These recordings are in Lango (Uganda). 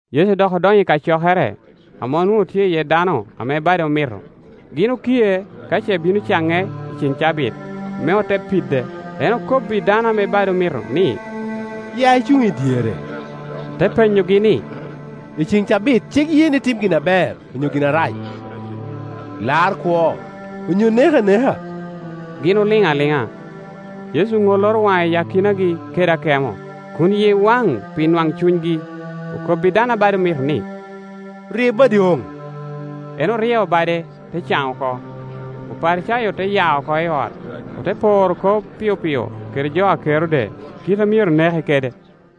Yecu dok odonyo i kacokere, ame onwoŋo tye iye dano ame bade omito. Gin okie ka ce bino caŋe i ceŋ cabit, me ote pide. En okobbi dano ame bade omito ni, “Ya icuŋ i dyere.” Te penyogi ni, “I ceŋ cabit cik ye ni tim iye gin aber onyo gin arac, lar kwo onyo nek aneka?” Gin oliŋ aliŋa. Yecu oŋoloro waŋe i akinagi kede akemo, kun yie waŋ pi nwaŋcunygi; okobbi dano a bade omito ni, “Rye badi oŋ.” En oryeo bade, te caŋ oko. Oparicayo te ya oko i ot, ote poro kop pio pio kede jo a Kerode kite a myero neke kede.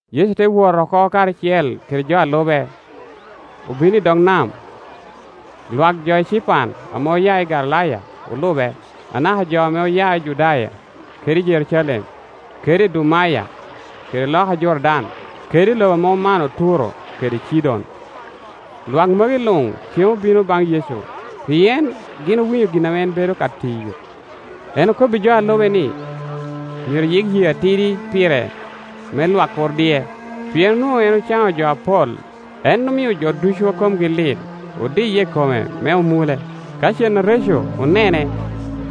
Yecu te wot oko karacel kede jo a lube, obino i dog nam. Lwak jo ecipan ame oya i Galilaya olube, anaka jo ame oya i Judaya, kede i Jerucalem, kede ldumaya, kede loka Jordan, kede i lobo ame omano Turo kede Cidon. Lwak magi luŋ cen obino baŋ Yecu pien gin owinyo gin ame en bedo ka tiyo. En okobbi jo a lube ni myero yik yee atidi pire, me lwak kur dic; pien onwoŋo en ocaŋo jo apol, en omio jo ducu a komgi lit odiye i kome me omule. Ka cen areco onene,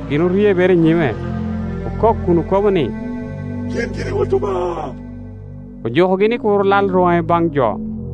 gin oryebere i nyime, okok kun okobo ni, “Yin giri i Wot Obaŋa.” Ojukogi ni kur lal rwoŋe baŋ jo.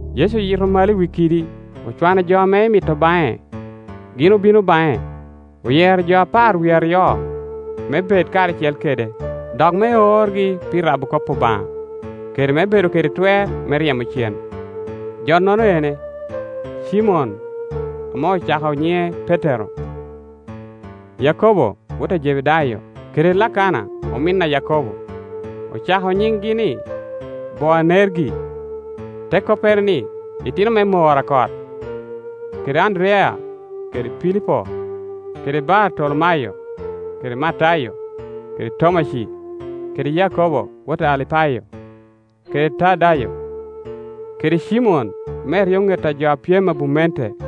Yecu oyito malo i wi kidi, ocwano jo ame emito baŋe; gin obino baŋe. Oyero jo apar wie aryo me bed karacel kede, dok me orgi pi rabo kop Obaŋa, kede me bedo kede twer me ryemo cen. Jonono ene: Cimon ame ocako nyiŋe Petero; Yakobo wot a Jebedayo, kede Lakana omin a Yakobo; ocako nyiŋgi ni Boanergi, te koppere ni, itino me mor a kot; kede Anderiya kede Pilipo, kede Bartolomayo, kede Matayo, kede Tomaci, kede Yakobo wot a Alipayo, kede Tadayo, kede Cimon me eryoŋet a jo a pyem i abumente,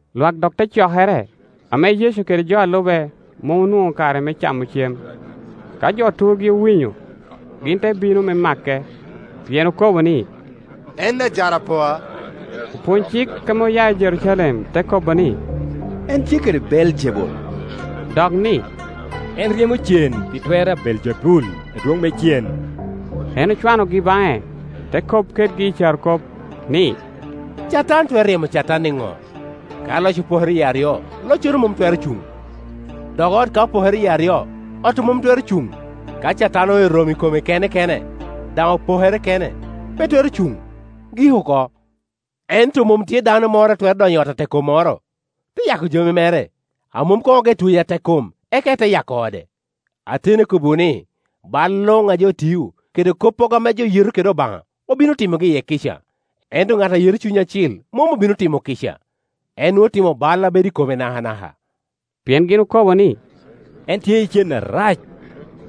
Lwak dok te cokere, ame Yecu kede jo a lube mom onwoŋo ka re me camo cem. Ka jo turgi owinyo, gin te bino me make, pien okobo ni, “En ajarapoa.” Opwonycik ame oya i Jerucalem te kobo ni, “En tye kede Beeljebul,” dok ni, “En ryemo cen pi twer a Beeljebul, adwoŋ me cen.” En ocwanogi baŋe, te kop kedgi i carokop, ni, “Catan twero ryemo Catan niŋo? Ka loc opokere yie aryo, loccono mom twero cuŋ. Dok ot ka opokere yie aryo, ot-tu mom twero cuŋ. Ka Catan oero romo i kome kene kene, daŋ opokere kene, pe twero cuŋ, gik oko. Ento mom tye dano moro a twero donyo i ot atekkommoro, te yako jami mere, a mom koŋ ogeo tweyo atekkom eka ete yako ode. “Ateni akobbiwu ni, bal luŋ a jo tiyo, kede koppogo ame jo yeto kede Obaŋa, obino timogi iye kica; ento ŋat a yeto Cuny Acil mom obino timo kica, en nwoŋo otimo bal a bedo i kome nakanaka Pien gin okobo ni, En tye i cen arac.”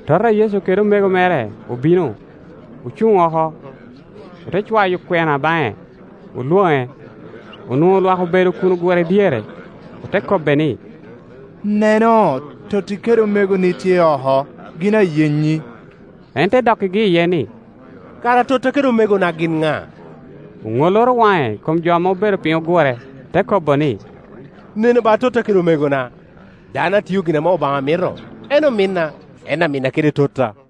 Tota a Yecu kede omego mere obino, ocuŋ oko, ote cwayo kwena baŋe, olwoŋe. Onwoŋo lwak obedo kun ogure dyere; ote kobbe ni, “Neno, totti kede omegoni tye oko, gin a yenyi.” En te dokkigi iye ni, “Kara totta kede omegona gin ŋa?” Oŋoloro waŋe i kom jo ame obedo piny ogure, te kobo ni, “Nenu ba totta kede omegona. Dano a tio gin ame Obanga mito en ominna, en aminna kede totta”